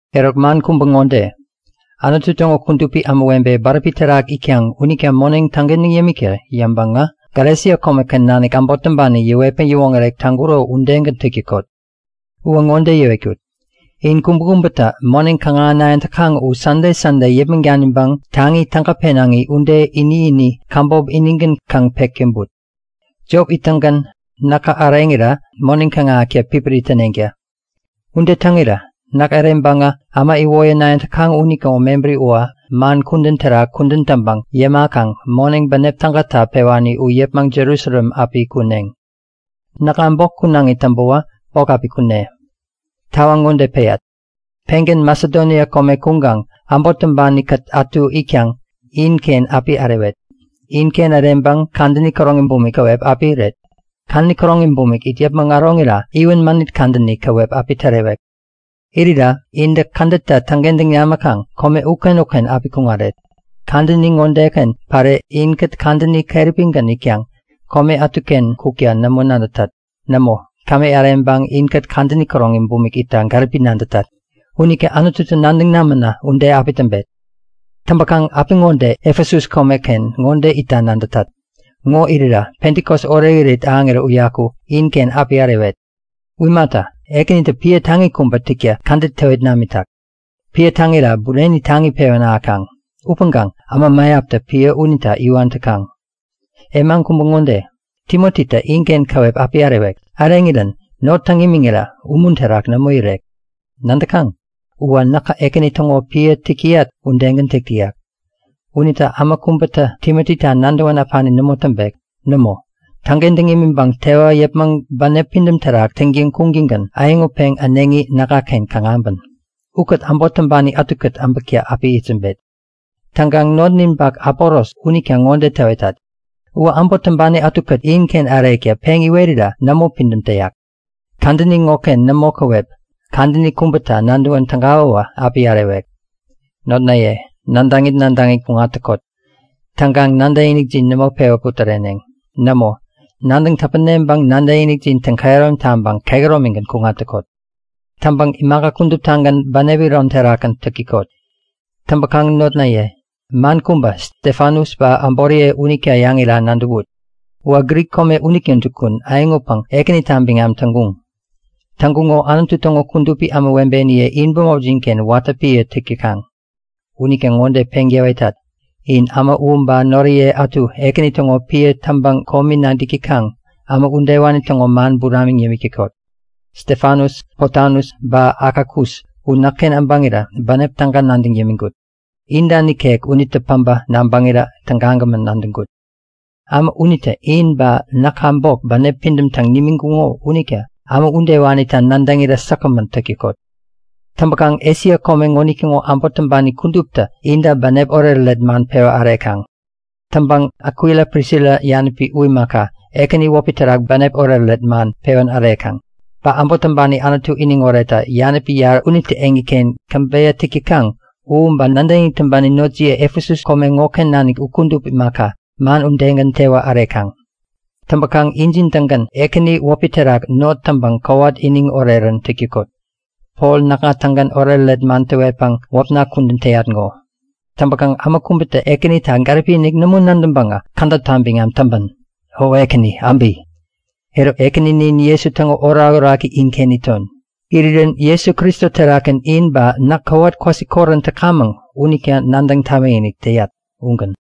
Eruk man kubä ŋode; Anutu täŋo kudupi ämawebe bäräpi terak itkaŋ unita moneŋ täŋkentäŋ yämikta yäŋpäŋä Galesia komeken nanik äbot täŋpani yäwetpäŋ yäwoŋärek täŋkuro udegän täk täkot. Uwä ŋode yäwetkut; In kubäkubätä moneŋ kaŋ-ahänayäŋ täkaŋ u Sande Sande yäpmäŋ daniŋpäŋ taŋi täga penaŋi ude ini-ini käbop inigän kaŋ pek täŋput. Jop ittäŋgän näkä äreŋira moneŋ kaŋ-ahäkta pipiri täneŋta. Ude täŋirä näk äreŋpäŋä äma iwoyänayäŋ täkaŋ unitäŋo mebäri uwä man kudän terak kudän täŋpäŋ yämakaŋ moneŋ bänep tägata pewani u yäpmäŋ Jerusalem api kuneŋ. Näkŋa bok kunaŋi täŋpäwä bok api kune. Tawaŋ ŋode peyat; Pengän Masedonia kome kuŋkaŋ äbot täŋpani-kät ätu itkaŋ inken api ärewet. Inken äreŋpäŋ kadäni käroŋi bumik käwep api iret. Kadäni käroŋi bumik it yäpmäŋ äroŋira iwän mänit kadäni käwep api tärewek. Irira intä kädetta täŋkentäŋ namäkaŋ kome uken-uken api kuŋaret. Kadäni ŋodeken päre inkät kadäni keräpigän itkaŋ kome ätuken kukta nämo nadätat. Nämo, kämi äreŋpäŋ inkät kadäni käroŋi bumik itta gäripi nadätat. Unita Anututä nadäŋ namänä ude api täŋpet. Täŋpäkaŋ apiŋode Efesus komeken ŋo itta nadätat. Ŋo irira Pentikos orekirit ahäŋirän uyaku inken api ärewet. U imata, ŋoken Ekänitä piä taŋi kubä täkta kädet täwit namitak. Piä täŋira bureni taŋi pewän ahäkaŋ. Upäŋkaŋ äma mäyaptä piä unita iwan täkaŋ. E man kubä ŋode; Timotitä inken käwep api ärewek. Äreŋirän not täŋ imiŋirä umun terak nämo irek. Nadäkaŋ, uwä näkä Ekäni täŋo piä täk täyat udegän täk täyak. Unita äma kubätä Timotita nadäwän äpani nämo täŋpek. Nämo, täŋkentäŋ imiŋpäŋ tewä yäpmäŋ bänep pidäm terak täŋtäŋ kuŋtäŋgän äyäŋutpeŋ äneŋi näkŋaken kaŋ äbän. Ukät äbot täŋpani ätukät äbäkta api itsämbet. Täŋkaŋ notninpak Apolos unita ŋode täwetat; Uwä äbot täŋpani ätukät inken ärekta peŋ iwerira nämo pidäm täyak. Kadäni ŋoken nämo käwep, kadäni kubäta nadäwän tägawäwä api ärewek. Notnaye, nadäŋit nadäŋit kuŋat täkot. Täŋkaŋ nadäkinikjin nämo pewä putäreneŋ. Nämo, nadäŋ täpäneŋpäŋ nadäkinikjin täŋkehärom taŋpäŋ kehäromigän kuŋat täkot. Täŋpäŋ imaka kuduptagän bänep iron terakgän täk täkot. Täŋpäkaŋ notnaye, man kubä, Stefanus ba äboriye unita yäŋira nadäwut. Uwä Grik komeken unitä jukun bänep äyäŋutpäŋ Ekänita biŋam täŋkuŋ. Täŋkuŋo Anutu täŋo kudupi ämawebeniye in bämopjin-ken watä piä täk täkaŋ. Unita ŋode peŋ täwetat; In äma u ba noriye ätu Ekäni täŋo piä täŋpäŋ komi nadäk täkaŋ, äma udewani täŋo man buramiŋ yämik täkot. Stefanus, Potanus, ba Akakus u näkken äbäŋirä bänep täga nadäŋ yämiŋkut. Inta nikek unitä päbä nabäŋirä tägagämän nadäŋkut. Äma unitä in ba näka bok bänep pidäm täŋ nimiŋkuŋo unita äma udewanita nadäŋirä säkgämän täk täkot. Täŋpäkaŋ Esia kome ŋonitäŋo äbot täŋpani kuduptä inta bänep oretoret man pewä ärekaŋ. Täŋpäŋ Akwila Prisila yanäpi u imaka, Ekäni wäpi terak bänep oretoret man pewän ärekaŋ. Ba äbot täŋpani Anutu iniŋoretta yanäpi yarä unitä eŋiken käbeyä täk täkaŋ u, ba nadäkinik täŋpani notjiye Efesus kome ŋoken nanik u kudup imaka, man udegän tewä ärekaŋ. Täŋpäkaŋ injin-tägän Ekäni wäpi terak not täŋpäŋ kowat iniŋ orerän täk täkot. Pol näkŋa-tägän oretoret man täwetpäŋ wäpna kudän täyat ŋo. Täŋpäkaŋ äma kubätä Ekänita gäripi-inik nämo nadäŋpäŋä kädäpta biŋam täŋpän! O Ekäni, äbi! Eruk, Ekäninin Jesu täŋo orakoraki inken iton. Irirän Jesu Kristo terakgän in ba näk kowat kwasikorän täkamäŋ unita nadäŋ tamikinik täyat. Ugän.